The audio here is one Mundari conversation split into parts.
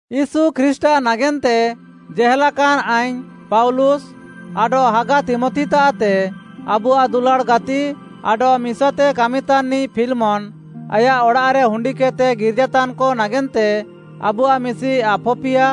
ୟୀଶୁ ଖ୍ରୀଷ୍ଟ୍‌ଆଃ ନାଗେନ୍ତେ ଜେହେଲାକାନ୍‌ ଆଇଙ୍ଗ୍‌ ପାଉଲୁସ୍‌ ଆଡଃ ହାଗା ତୀମଥିତାଃଏତେ, ଆବୁଆଃ ଦୁଲାଡ଼୍‌ ଗାତି ଆଡଃ ମିସାତେ କାମିତାନ୍‌ନିଃ ଫିଲ୍‌ମନ୍‌, ଆୟାଃ ଅଡ଼ାଃରେ ହୁଣ୍ଡିକେଦ୍‌ତେ ଗିର୍ଜାତାନ୍‌କ ନାଗେନ୍ତେ, ଆବୁଆଃ ମିଶି ଆଫପିୟା,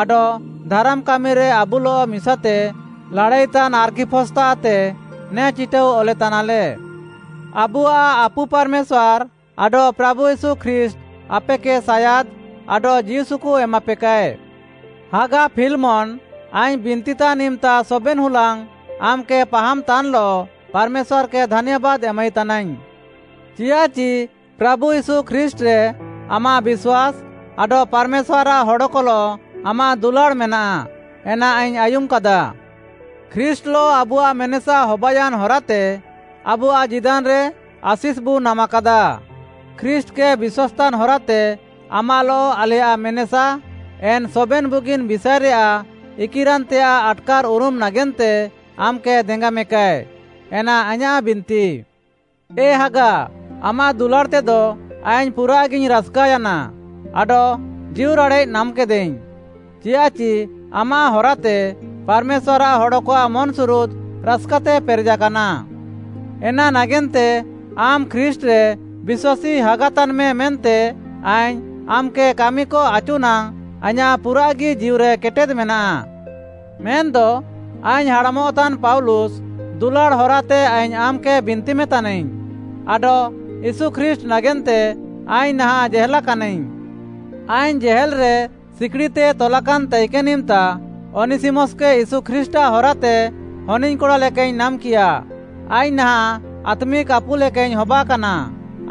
ଆଡଃ ଧାରାମ୍ କାମିରେ ଆବୁଲଃ ମିସାତେ ଲାଡ଼ାଇତାନ୍‌ ଆର୍ଖିପସ୍‌ତାଃତେ ନେ ଚିଟାଉ ଅଲେତାନାଲେ। ଆବୁଆଃ ଆପୁ ପାର୍‌ମେଶ୍ୱାର୍‌ ଆଡଃ ପ୍ରାଭୁ ୟୀଶୁ ଖ୍ରୀଷ୍ଟ୍‌ ଆପେକେ ସାୟାଦ୍‌ ଆଡଃ ଜୀଉସୁକୁ ଏମାପେକାଏ। ହାଗା ଫିଲ୍‌ମନ୍‌, ଆଇଙ୍ଗ୍‌ ବିନ୍ତିତାନ୍‌ ଇମ୍‌ତା ସବେନ୍‌ ହୁଲାଙ୍ଗ୍‌ ଆମ୍‌କେ ପାହାମ୍‌ତାନ୍‌ଲଃ ପାର୍‌ମେଶ୍ୱାର୍‌କେ ଧାନ୍ୟାବାଦ୍‌ ଏମାଇତାନାଇଙ୍ଗ୍‌। ଚିୟାଃଚି ପ୍ରାଭୁ ୟୀଶୁ ଖ୍ରୀଷ୍ଟ୍‌ରେ ଆମାଃ ବିଶ୍ୱାସ୍‌ ଆଡଃ ପାର୍‌ମେଶ୍ୱାର୍‌ଆଃ ହଡ଼କଲଃ ଆମାଃ ଦୁଲାଡ଼୍‌ ମେନାଃ, ଏନା ଆଇଙ୍ଗ୍‌ ଆୟୁମ୍‌କାଦା। ଖ୍ରୀଷ୍ଟ୍‌ଲଃ ଆବୁଆଃ ମେନେସା ହବାୟାନ୍‌ ହରାତେ ଆବୁଆଃ ଜୀଦାନ୍‌ରେ ଆଶିଷ୍‌ବୁ ନାମାକାଦା। ଖ୍ରୀଷ୍ଟ୍‌କେ ବିଶ୍ୱାସ୍‌ତାନ୍‌ ହରାତେ ଆମାଃଲଃ ଆଲେୟାଃ ମେନେସା, ଏନ୍‌ ସବେନ୍‌ ବୁଗିନ୍‌ ବିଷାଏରେୟାଃ ଇକିରାନ୍‌ତେୟାଃ ଆଟ୍‌କାର୍‌ଉରୁମ୍‌ ନାଗେନ୍ତେ ଆମ୍‌କେ ଦେଙ୍ଗାମେକାଏ, ଏନା ଆଇଁୟାଃ ବିନ୍ତି। ଏ ହାଗା, ଆମାଃ ଦୁଲାଡ଼୍‌ତେଦ ଆଇଙ୍ଗ୍‌ ପୁରାଃଗିଙ୍ଗ୍‌ ରାସ୍‌କାୟାନା ଆଡଃ ଜୀଉରାଡ଼େଃ ନାମ୍‌କେଦାଇଙ୍ଗ୍‌। ଚିୟାଃଚି ଆମାଃ ହରାତେ, ପାର୍‌ମେଶ୍ୱାର୍‌ଆଃ ହଡ଼କଆଃ ମନ୍‌ସୁରୁଦ୍‌ ରାସ୍‌କାତେ ପେରେଜାକାନା। ଏନା ନାଗେନ୍ତେ ଆମ୍‌ ଖ୍ରୀଷ୍ଟ୍‌ରେ ବିଶ୍ୱାସୀ ହାଗାତାନ୍‌ମେ ମେନ୍ତେ ଆଇଙ୍ଗ୍‌ ଆମ୍‌କେ କାମିକ ଆଚୁ ନାଙ୍ଗ୍‌ ଆଇଁୟାଃ ପୁରାଃଗି ଜୀଉରେ କେଟେଦ୍‌ ମେନାଃ। ମେନ୍‌ଦ ଆଇଙ୍ଗ୍‌ ହାଡ଼ାମଃତାନ୍‌ ପାଉଲୁସ୍‌, ଦୁଲାଡ଼୍‌ ହରାତେ ଆଇଙ୍ଗ୍‌ ଆମ୍‌କେ ବିନ୍ତିମେ ତାନାଇଙ୍ଗ୍‌, ଆଡଃ ୟୀଶୁ ଖ୍ରୀଷ୍ଟ୍‌ ନାଗେନ୍ତେ ଆଇଙ୍ଗ୍‌ ନାହାଁଃ ଜେହେଲା କାନାଇଙ୍ଗ୍‌। ଆଇଙ୍ଗ୍‌ ଜେହେଲ୍‌ରେ ସିକିଡ଼ିତେ ତଲାକାନ୍‌ ତାଇକେନ୍‌ ଇମ୍‌ତା ଅନିସିମସ୍‌କେ ୟୀଶୁ ଖ୍ରୀଷ୍ଟ୍‌ଆଃ ହରାତେ ହନିଙ୍ଗ୍‌କଡ଼ା ଲେକାଇଙ୍ଗ୍‌ ନାମ୍‌କିୟା, ଆଇଙ୍ଗ୍‌ ନାହାଁଃ ଆତ୍ମିକ୍‌ ଆପୁ ଲେକାଇଙ୍ଗ୍‌ ହବାକାନା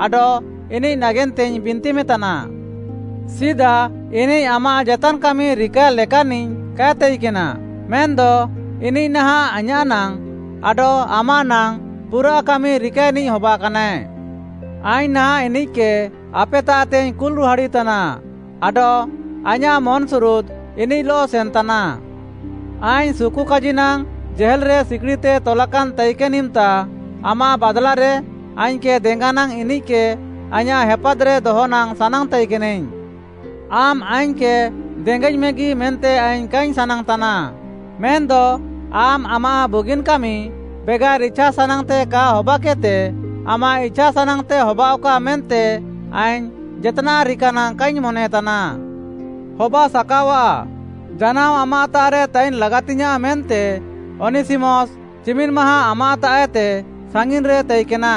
ଆଡଃ ଇନିଃ ନାଗେନ୍ତେଇଙ୍ଗ୍‌ ବିନ୍ତିମେତାନା। ସିଦା ଇନିଃ ଆମାଃ ଜେତାନ୍‌ କାମି ରିକାଏ ଲେକାନ୍‌ନିଃ କାଏ ତାଇକେନା, ମେନ୍‌ଦ ଇନିଃ ନାହାଁଃ ଆଇଁୟାଃ ନାଙ୍ଗ୍‌ ଆଡଃ ଆମାଃ ନାଙ୍ଗ୍‌ ପୁରାଃ କାମି ରିକାଏନିଃ ହବାକାନାଏ। ଆଇଙ୍ଗ୍‌ ନାହାଁଃ ଇନିଃକେ ଆପେତାଃତେଇଙ୍ଗ୍‌ କୁଲ୍‌ ରୁହାଡ଼ିତାନା, ଆଡଃ ଆଇଁୟାଃ ମନ୍‌ସୁରୁଦ୍‌ ଇନିଃଲଃ ସେନ୍‌ତାନା। ଆଇଙ୍ଗ୍‌ ସୁକୁକାଜି ନାଙ୍ଗ୍‌ ଜେହେଲ୍‌ରେ ସିକିଡ଼ିତେ ତଲାକାନ୍‌ ତାଇକେନ୍‌ ଇମ୍‌ତା ଆମାଃ ବାଦ୍‍ଲାରେ ଆଇଙ୍ଗ୍‌କେ ଦେଙ୍ଗାନାଙ୍ଗ୍‌ ଇନିଃକେ ଆଇଁୟାଃ ହେପାଦ୍‌ରେ ଦହନାଙ୍ଗ୍‌ ସାନାଙ୍ଗ୍‌ ତାଇକେନାଇଙ୍ଗ୍‌। ଆମ୍‌ ଆଇଙ୍ଗ୍‌କେ ଦେଙ୍ଗାଇଙ୍ଗ୍‌ମେଗି ମେନ୍ତେ ଆଇଙ୍ଗ୍‌ କାଇଙ୍ଗ୍‌ ସାନାଙ୍ଗ୍‌ତାନା, ମେନ୍‌ଦ ଆମ୍‌ ଆମାଃ ବୁଗିନ୍‌ କାମି ବେଗାର୍‌ ଇଛାସାନାଙ୍ଗ୍‌ତେ କା ହବାକେଦ୍‌ତେ, ଆମାଃ ଇଛାସାନାଙ୍ଗ୍‌ତେ ହବାଅଃକା, ମେନ୍ତେ ଆଇଙ୍ଗ୍‌ ଜେତ୍‌ନାଃ ରିକାନାଙ୍ଗ୍‌ କାଇଙ୍ଗ୍‌ ମନେତାନା। ହବାସାକାଅଆଃ, ଜାନାଅ ଆମାଃତାଃରେ ତାଇନ୍‌ ଲାଗାତିଙ୍ଗ୍‌ୟାଁଃ ମେନ୍ତେ ଅନିସିମସ୍‌ ଚିମିନ୍‌ ମାହାଁ ଆମାଃତାଃଏତେ ସାଙ୍ଗିନ୍‌ରେ ତାଇକେନା।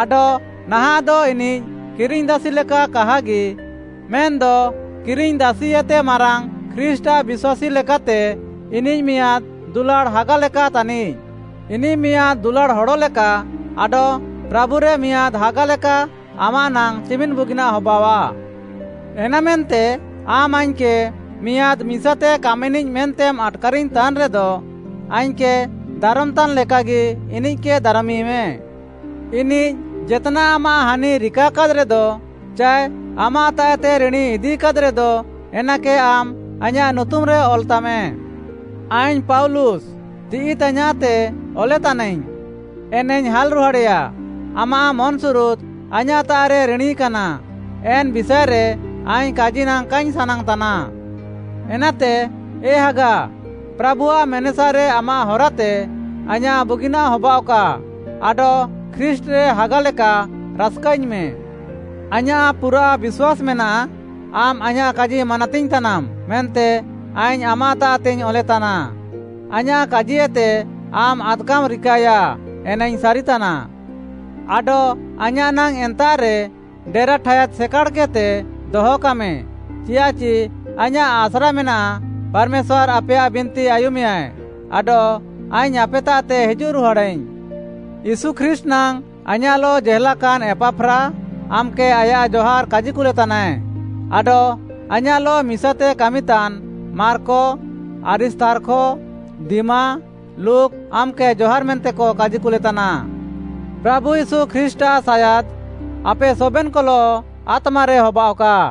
ଆଡଃ ନାହାଁଃଦ ଇନିଃ କିରିଙ୍ଗ୍‌ ଦାସି ଲେକା କାହାଗି, ମେନ୍‌ଦ କିରିଙ୍ଗ୍‌ଦାସିଏତେ ମାରାଙ୍ଗ୍‌ ଖ୍ରୀଷ୍ଟ୍‌ଆଃ ବିଶ୍ୱାସୀ ଲେକାତେ ଇନିଃ ମିଆଁଦ୍‌ ଦୁଲାଡ଼୍‌ ହାଗା ଲେକା ତାନିଃ। ଏନାତେ ଇନିଃ ଆଇଁୟାଃ ଦୁଲାଡ଼୍‌ ହାଗା ତାନିଃ। ଇନିଃ ମିଆଁଦ୍‌ ଦୁଲାଡ଼୍‌ ହଡ଼ ଲେକା ଆଡଃ ପ୍ରାଭୁରେ ମିଆଁଦ୍‌ ହାଗା ଲେକା ଆମାଃ ନାଙ୍ଗ୍‌ ଚିମିନ୍‌ ବୁଗିନାଃ ହବାଅଃଆ। ଏନାମେନ୍ତେ ଆମ୍‌ ଆଇଙ୍ଗ୍‌କେ ମିଆଁଦ୍‌ ମିସାତେ କାମିନିଃ ମେନ୍ତେମ୍‌ ଆଟ୍‌କାରିଙ୍ଗ୍‌ ତାନ୍‌ରେଦ, ଆଇଙ୍ଗ୍‌କେ ଦାରମ୍‌ତାନ୍‌ଲେକାଗି ଇନିଃକେ ଦାରମିମେ। ଇନିଃ ଜେତ୍‌ନାଃ ଆମାଃ ହାନି ରିକାକାଦ୍‌ରେଦ ଚାଏ ଆମାଃତାଃଏତେ ରିଣୀ ଇଦିକାଦ୍‌ରେଦ, ଏନାକେ ଆମ୍‌ ଆଇଁୟାଃ ନୁତୁମ୍‌ରେ ଅଲ୍‌ତାମେ। ଆଇଙ୍ଗ୍‌ ପାଉଲୁସ୍‌, ତିଃଇ ତାଇୟାଃଁତେ ଅଲେତାନାଇଙ୍ଗ୍‌, ଏନାଇଙ୍ଗ୍‌ ହାଲ୍‌ରୁହାଡ଼େଆ। ଆମାଃ ମନ୍‌ସୁରୁଦ୍‌ ଆଇଁୟାଃତାଃରେ ରିଣୀ କାନା, ଏନ୍‌ ବିଷାଏରେ ଆଇଙ୍ଗ୍‌ କାଜି ନାଙ୍ଗ୍‌ କାଇଙ୍ଗ୍‌ ସାନାଙ୍ଗ୍‌ତାନା। ଏନାତେ ଏ ହାଗା, ପ୍ରାଭୁଆଃ ମେନେସାରେ ଆମାଃ ହରାତେ ଆଇଁୟାଃ ବୁଗିନାଃ ହବାଅଃକା, ଆଡଃ ଖ୍ରୀଷ୍ଟ୍‌ରେ ହାଗାଲେକା ରାସ୍‌କାଇଙ୍ଗ୍‌ମେ। ଆଇଁୟାଃ ପୁରା ବିଶ୍ୱାସ୍‌ ମେନାଃ, ଆମ୍‌ ଆଇଁୟାଃ କାଜି ମାନାତିଙ୍ଗ୍‌ତାନାମ୍‌ ମେନ୍ତେ ଆଇଙ୍ଗ୍‌ ଆମାତାଃତେଇଙ୍ଗ୍‌ ଅଲେତାନା, ଆଇଁୟାଃ କାଜିଏତେ ଆମ୍‌ ଆଦ୍‌କାମ୍‌ ରିକାୟା, ଏନାଇଙ୍ଗ୍‌ ସାରିତାନା। ଆଡଃ ଆଇଁୟାଃ ନାଙ୍ଗ୍‌ ଏନ୍ତାଃରେ ଡେରା ଠାୟାଦ୍‌ ସେକାଡ଼୍‌କେଦ୍‌ତେ ଦହକାମେ ଚିୟାଃଚି ଆଇଁୟାଃ ଆସ୍ରା ମେନାଃ, ପାର୍‌ମେଶ୍ୱାର୍‌ ଆପେୟାଃ ବିନ୍ତି ଆୟୁମେୟା ଆଡଃ ଆଇଙ୍ଗ୍‌ ଆପେତାଃତେ ହିଜୁଃରୁହାଡ଼ାଇଙ୍ଗ୍‌। ୟୀଶୁ ଖ୍ରୀଷ୍ଟ୍‌ ନାଙ୍ଗ୍‌ ଆଇଁୟାଃଲଃ ଜେହେଲାକାନ୍‌ ଏପାଫ୍ରା, ଆମ୍‌କେ ଆୟାଃ ଜହାର୍‌ କାଜିକୁଲେତାନାଏ, ଆଡଃ ଆଇଁୟାଃଲଃ ମିସାତେ କାମିତାନ୍ ମାର୍କ, ଆରିସ୍ତାର୍ଖ, ଦିମା, ଲୁକ୍‌ ଆମ୍‌କେ ଜହାର୍‍ ମେନ୍ତେକ କାଜିକୁଲେତାନା। ପ୍ରାଭୁ ୟୀଶୁ ଖ୍ରୀଷ୍ଟ୍‌ଆଃ ସାୟାଦ୍ ଆପେ ସବେନ୍‌କଲଃ ଆତ୍ମାରେ ହାବାଅଃକା।